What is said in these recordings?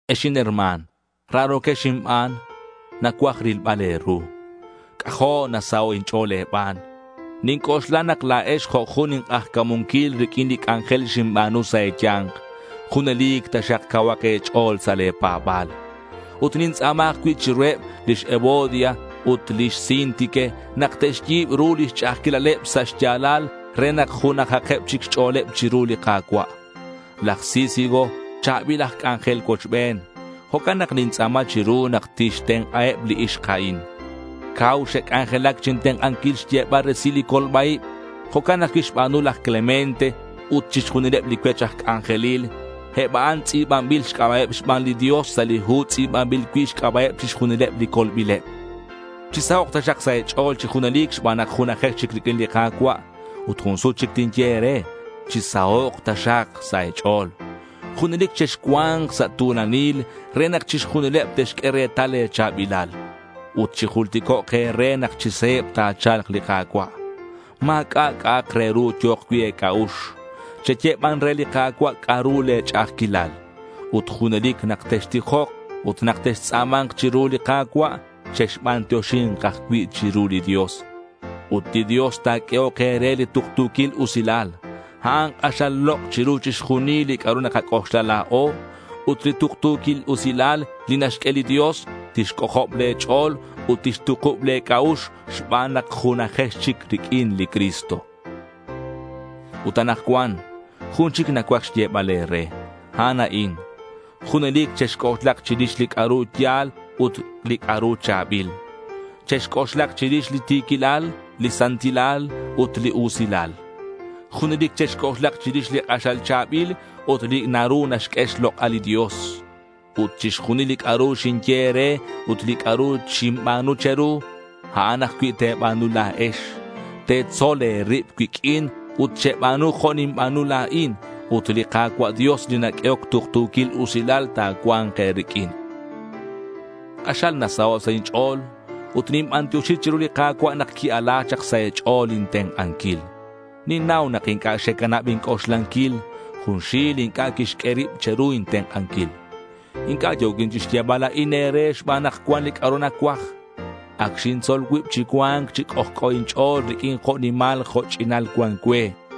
Ex inherma̱n, raro̱quex inban, nacuaj rilbal e̱ru. C'ajo' nasaho' inch'o̱l e̱ban. Ninc'oxla nak la̱ex jo' jun ink'ajca̱munquil riq'uin li c'anjel xinba̱nu sa' e̱ya̱nk. Junelic taxak cauhak e̱ch'o̱l sa' le̱ pa̱ba̱l. Ut nintz'a̱ma ajcui' chiruheb lix Evodia ut lix Síntique nak te'xyi̱b ru lix ch'a'ajquilaleb sa' xya̱lal re nak junajakeb chic xch'o̱leb chiru li Ka̱cua'. Laj Sícigo cha̱bil aj c'anjel cuochben. Jo'can nak nintz'a̱ma chiru nak tixtenk'aheb li ixk a'in. Cau xe'c'anjelac chintenk'anquil xyebal resil li colba-ib. Jo'can ajcui' xba̱nu laj Clemente ut chixjunileb li cuech aj c'anjelil. Eb a'an tz'i̱banbil xc'aba'eb xban li Dios sa' li hu tz'i̱banbil cui' xc'aba'eb chixjunileb li colbileb. Chisahok' taxak sa' e̱ch'o̱l chi junelic xban nak junajex chic riq'uin li Ka̱cua'. Ut jun sut chic tinye e̱re: Chi sahok' taxak sa' e̱ch'o̱l. Junelic chexcua̱nk sa' tu̱lanil re nak chixjunileb te'xq'ue retal le̱ cha̱bilal. Ut chijulticok' ajcui' e̱re nak chi se̱b ta̱cha̱lk li Ka̱cua'. Ma̱c'a' c'a'ak re ru yo̱k cui' e̱c'a'ux. Cheye ban re li Ka̱cua' c'a'ru le̱ ch'a'ajquilal. Ut junelic nak textijok ut nak textz'a̱ma̱nk chiru li Ka̱cua', chexbantioxi̱nk ajcui' chiru li Dios. Ut li Dios ta̱q'uehok e̱re li tuktu̱quil usilal. A'an k'axal lok' chiru chixjunil li c'a'ru nakac'oxla la̱o. Ut li tuktu̱quil usilal li naxq'ue li Dios tixc'ojob le̱ ch'o̱l ut tixtukub le̱ c'a'ux xban nak junajex chic riq'uin li Cristo. Ut anakcuan, jun chic nacuaj xyebal e̱re. A'an a'in: junelic chexc'oxlak chirix li c'a'ru ya̱l ut li c'a'ru cha̱bil. Chexc'oxlak chirix li ti̱quilal, li santilal, ut li usilal. Junelic chexc'oxlak chirix li k'axal cha̱bil ut li naru naxq'ue xlok'al li Dios. Ut chixjunil li c'a'ru xinye e̱re ut li c'a'ru xinba̱nu che̱ru, a'an ajcui' te̱ba̱nu la̱ex. Chetzol e̱rib cuiq'uin ut cheba̱nu jo' ninba̱nu la̱in. Ut li Ka̱cua' Dios li naq'uehoc tuktu̱quil usilal ta̱cua̱nk e̱riq'uin. K'axal nasaho' sa' inch'o̱l ut ninbantioxi chiru li Ka̱cua' nak qui-ala chak sa' e̱ch'o̱l intenk'anquil. Ninnau nak inc'a' xecanab inc'oxlanquil. Junxil inc'a' quixq'ue rib che̱ru intenk'anquil. Inc'a' yo̱quin chixyebal a'in e̱re xban nak cuan li c'a'ru nacuaj. Ac xintzol cuib chi cua̱nc chi c'ojc'o inch'o̱l riq'uin jo' nimal jo' ch'inal cuan cue.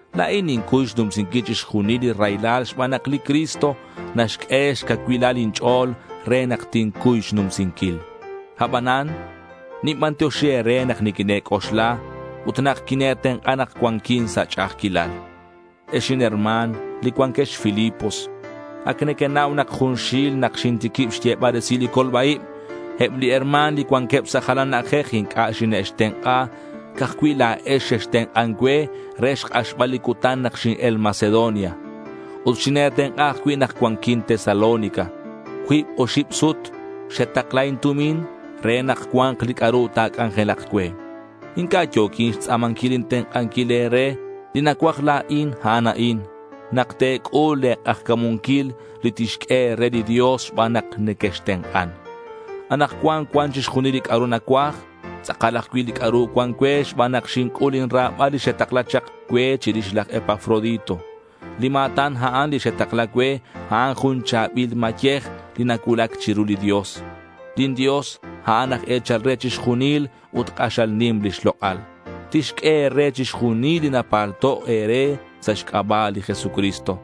La̱in nincuy xnumsinquil chixjunil li raylal xban nak li Cristo naxq'ue xcacuilal inch'o̱l re nak tincuy xnumsinquil. Abanan, ninbantioxi e̱re nak niquine̱c'oxla ut nak quine̱tenk'a nak cuanquin sa' ch'a'ajquilal. Ex inherma̱n, li cuanquex Filipos, ac nequenau nak junxil nak xintiquib xyebal resil li colba-ib, eb li herma̱n li cuanqueb sa' jalan na'ajej inc'a' xine'xtenk'a. Ca'aj cui' la̱ex xextenk'an cue re xk'axbal li cutan nak xin-el Macedonia. Ut xine̱tenk'a ajcui' nak cuanquin Tesalónica. Cuib oxib sut xetakla intumin re nak cua̱nk li c'a'ru ta̱c'anjelak cue. Inc'a' yo̱quin xtz'a̱manquil intenk'anquil e̱re. Li nacuaj la̱in, a'an a'in: nak te̱c'ul le̱ k'ajca̱munquil li tixq'ue e̱re li Dios xban nak nequextenk'an. Anakcuan cuan chixjunil li c'a'ru nacuaj. Tz'akal ajcui' li c'a'ru cuan cue xban nak xinc'ul lin ra̱bal li xetakla chak cue chirix laj Epafrodito. Li ma̱tan a'an li xetakla cue, a'an jun cha̱bil mayej li nacuulac chiru li Dios. Lin Dios, a'an aj e̱chal re chixjunil ut k'axal nim lix lok'al. Tixq'ue e̱re chixjunil li napalto' e̱re sa' xc'aba' li Jesucristo.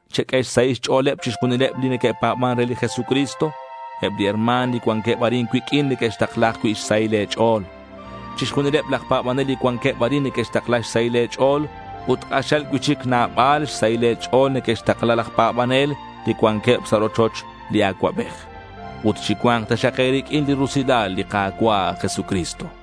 Cheq'ue xsahil xch'o̱leb chixjunileb li neque'pa̱ban re li Jesucristo. Eb li herma̱n li cuanqueb arin cuiq'uin neque'xtakla ajcui' xsahil e̱ch'o̱l. Chixjunileb laj pa̱banel li cuanqueb arin neque'xtakla xsahil e̱ch'o̱l. Ut k'axal cui'chic nabal xsahil e̱ch'o̱l neque'xtakla laj pa̱banel li cuanqueb sa' rochoch li acuabej. Ut chicua̱nk taxak e̱riq'uin li rusilal li Ka̱cua' Jesucristo.